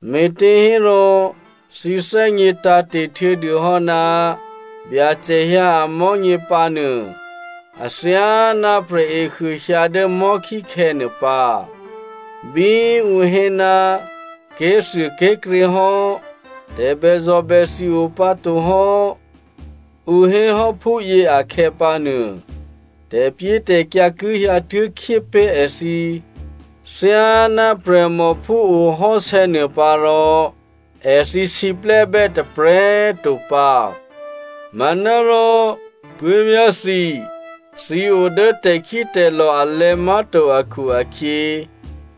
Me̤těhérò thǐ thè́gně tǎ̤te̤ htuô̌dûhò́ ná Byacè hyǎ amò̤́nyě pǎnuô, athyáná prè̤ehuô hyǎ dố mò̤́khíkhè̌ nuô pǎ. Bí ǔ hé, “Ké̤thuôké̤krě hò́, tè̤bèzò̤bèthi o pǎ tohò́” ǔ hé hò́ phúyě akhè̌pǎnuô, tè̤pyétè̤kyǎ ki hyǎtuố̤khyé pé̤ èthǐ thyáná prè̤mò phúohò́sè̌ nuôpǎ rò èthǐ siplè́bè́ tôprè̤꤮ to pǎ. Manárò, puố̤vyá̤ thǐ, thǐ o dố tè̤khítè̤lò̤ alè̤̌ má̤to akhu-akhyě,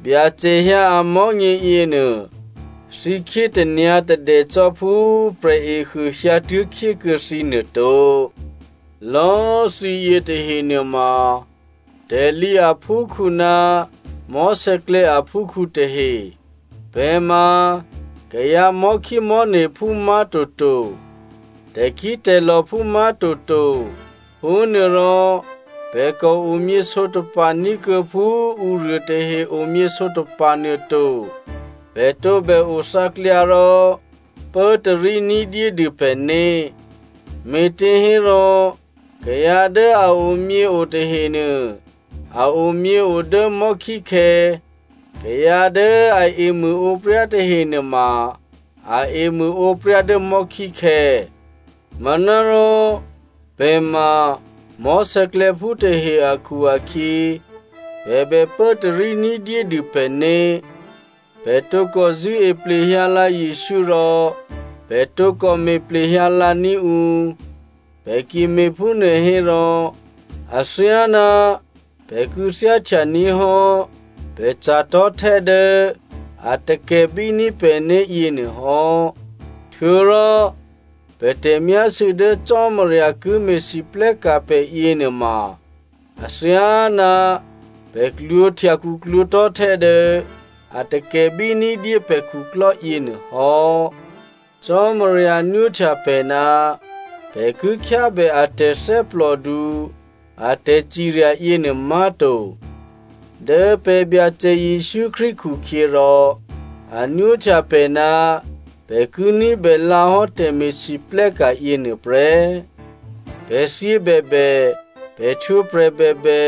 Byacè hyǎ amò̤́nyě yěnuô, thǐ khyé tanyǎ̤tadè cò́ phú prè̤ehuô hyǎtuố̤khyé kuô̌ thǐ nuô to. Lò̌꤮ thǐyě tahe nuôma tè̤lǐ aphúkhǔ ná mò̤́sè̌klè̌ aphúkhǔ tahe. Pè̤ ma kayǎ mò̤́khímò̤́ne̤phú má̤toto, tè̤khítè̤lò̤phú má̤toto. Phúnuôrò pè̤ kò omyě sǒtapa̤ ní̤kuô̌ phú ǔruô tahe omyě sǒtapa̤ nuôto. Pè̤ tǒbè othǎklyǎ rò pốtarí ní̤dyédû pè̤né̤. Me̤těhérò kayǎ dố a omyěo tahenuô a omyěo dố mò̤́khíkhè̌, kayǎ dố a emṳ̂ǒpryá tahe nuôma a emṳ̂ǒpryá dố mò̤́khíkhè̌. Manárò pè̤ ma mò̤́sè̌klè̌phú tahe akhu-akhyě, pè̤ bè pốtarí ní̤dyédû pè̤né̤. Pè̤ tǒkò zṳ̂́e plehyǎlǎ Jesǔ rò pè̤ tǒkò mo̤ plehyǎ lǎní̤ ǔ. Pè̤ ki me̤phúnuô hérò athyáná pè̤ kû̌thyáhtya ní̤ hò́ pè̤ ca̤tò̤́htè́ dố a takè̤bíní̤ pè̤né̤ yěnuôhò́, htuô̌rò pè̤ tè̤myásû̌ dố Cò́marya ki me̤lwóhteka̤ pè̤ yěnuôma athyáná pè̤ klwǒ̤htya khuklwǒ̤ tò̤́htè́ dố a takè̤bí ní̤dyé pè̤ khuklò́ yěnuôhò́. Cò́marya nwóhtya pè̤ ná pè̤ ki khyábè a tè̤thè́plòdu a tè̤cirya yěnuô má̤to. Dố pè̤ Byacè Jesǔ Krístu khukhyěrò, a nwóhtya pè̤ ná pè̤ ki ní̤bè lǎhò́ tè̤me̤lwóhteka̤ yěnuôprè́. Pè̤ thyě bèbè, pè̤ htwǒprè̤ bèbè,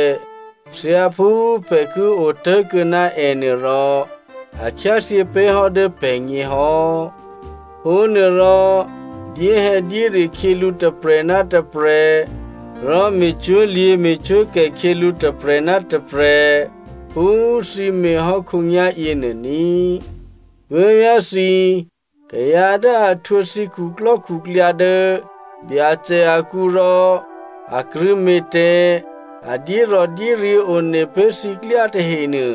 thyáphú pè̤ ki otố̤kuô̌ ná ènuôrò, a khyáthyě pé̤hò́ dố pè̤gně hò́. Phúnuôrò, dyéhè̌dyére khyělǔ tôprè̤ ná tôprè̤ rò me̤cwó̤lyě̤ me̤cwó̤kè khyělǔ tôprè̤ ná tôprè̤ phú thǐ me̤ hò́ khǒnyá̤ yěnuô ní꤮. Puố̤vyá̤thǐ, kayǎ dố a htwǒ thǐ khuklò́khuklyǎ dố Byacè akǔ rò a krṳ̂̌me̤ tè̤, a dyérò̤dyéryě̤ one pé̤ thǐklyá tahenuô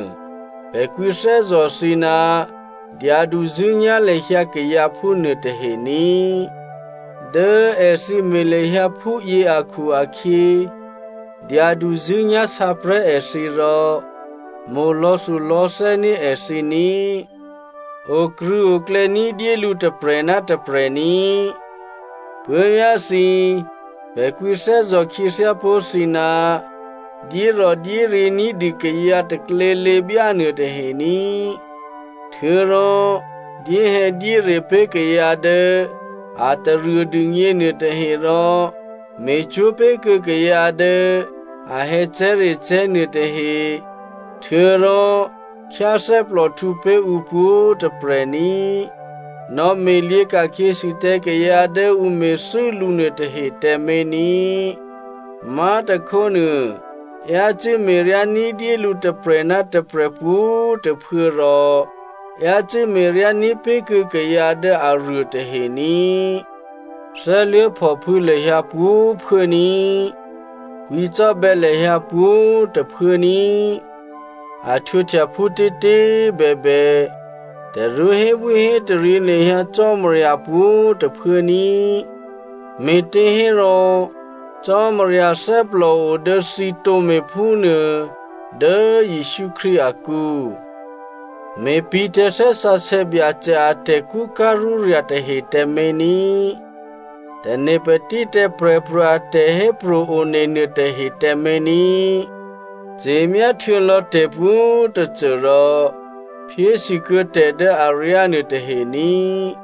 pè̤ kwǐthè́zò̤ thǐ ná dyaduzṳ̂́nyá̤ lahyǎ kayǎ phúnuô tahe ní꤮. Dố èthǐ me̤ lahyǎ phúyě akhu-akhyě, dyaduzṳ̂́nyá̤ sǎprè̤́ èthǐ rò mo̤ lò̌thulò̌thè́ní̤ èthǐ ní꤮. Okrṳ̂̌oklè̌ ní̤dyé lǔ tôprè̤ ná tôprè̤ ní꤮. Puố̤vyá̤thǐ, pè̤ kwǐthè́zò̤ khyěthyá pó̤ thǐ, dyérò̤dyéryě̤ ní̤dû kayǎ taklělěbyá nuôtahe ní꤮. Htuô̌rò dyéhè̌dyére pé̤ kayǎ dố a taruô dûgně nuôtahe rò me̤cwó̤ pé̤kuô̌ kayǎ dố a hè̌cè̤́recè̤́ nuôtahe, htuô̌rò khyáthè́plòhtǔ pé̤ ǔ pwǒ̤꤮ tôprè̤ ní꤮. Nò̌me̤lyě̤ ka̤khyěsû tǎ kayǎ dố ǔ me̤thû́ lǔ nuôtahe tǎmé̤ ní꤮. Má̤tôkhónuô, yácû́ me̤ryá ní̤dyé lǔ tôprè̤ ná tôprè̤ pwǒ̤꤮ tôphuố rò yácû́ me̤ryá ní̤pé̤kuô̌ kayǎ dố aruô tahe ní꤮. Thè́luố̤phòphû̌ lahyǎ pwǒ̤꤮ phuốní꤮. Kwǐcò́bè̌ lahyǎ pwǒ̤꤮ tôphuố ní꤮. A htwǒhtya phútětě꤮ bèbè, tarú hébwíhétaryě lahyǎ Cò́marya pwǒ̤꤮ tôphuố ní꤮. Me̤těhérò, Cò́marya thè́plòo dố thǐ tǒme̤ phúnuô dố Jesǔ Krístu akǔ. Me̤pǐ̤ tǎ Thè́ Sǎsè̌ Byacè a tè̤kṳ́ká̤rúrya̤ tahe tǎmé̤ ní꤮. Tane̤ patí tǎ prè̤pro̤ a tè̤hépro̤ one nuôtahe tǎmé̤ ní꤮. Ce̤myá htuô̌lò̌ tè̤pwǒ̤꤮ tôcô rò phyésûkuô̌ tè̤ dố aryá nuôtahe ní꤮.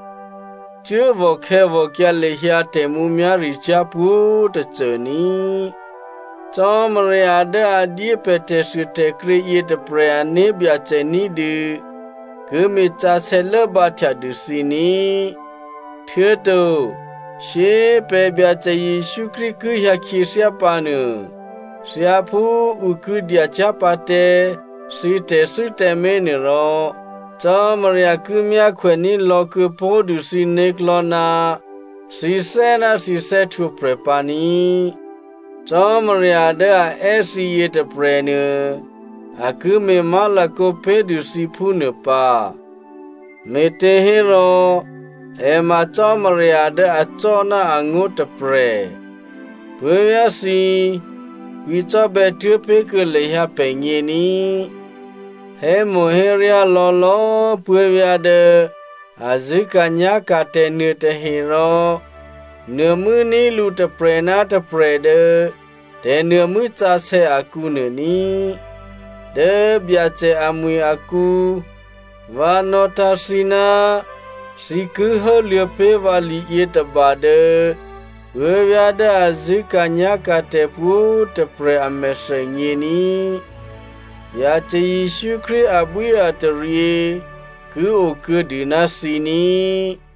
Cuốvò̤ khè̌vò̤kyǎ lahyǎ tè̤mǔmyá̤ricyá̤ pwǒ̤꤮ tôcô ní꤮. Cò́marya dố a dyé pè̤ tè̤thuôtè̤krě yětôprè̤ ané̤byacè ní̤dû ki me̤sǎsè̌ lốbǎhtya dû thǐ ní꤮. Htuô̌to shyé꤮ pè̤ Byacè Jesǔ Krístu ki hyǎ khyěthyá pǎnuô, thyáphú ǔ ki dyacyá̤pǎ tǎ thǐ tè̤thû́ tǎmé̤ nuôrò, Cò́marya ki myákhwèní̤ lò̌kuô̌ pó̤dû thǐ né̤klò̤́ ná thǐthè́ ná thǐ thè́htwǒprè̤ pǎ ní꤮. Cò́marya dố a è́ thǐ yětôprè̤nuô, a ki me̤ má̤lakǒ pé̤dû thǐ phúnuô pǎ, me̤těhérò è ma Cò́marya dố acò́ ná angó̤ tôprè̤. Puố̤vyá̤thǐ, kwǐcò́bè̌ tuố̤ pé̤kuô̌ lahyǎ pè̤gně ní꤮. Hémo̤héryá lò̌lò̌꤮ puố̤vyá̤ dố a zṳ̂́ka̤nyá̤ka̤tè̤ nuôtahe rò nuô̤mû́ní̤ lǔ tôprè̤ ná tôprè̤ dố tè̤nuô̤mû́ sǎsè̌ akǔnuô ní꤮. Dố Byacè amwi̤ akǔ, vǎ nò̌tǎ̤ thǐ ná thǐ ki hốluô̌ pé̤ vǎ liyětôba dố puố̤vyá̤ dố a zṳ̂́ka̤nyá̤ka̤tè̤ pwǒ̤꤮ tôprè̤ a mèthènyě ní꤮. Byacè Jesǔ Krístu abwíataryě ki okuô̌dû ná thǐ ní꤮.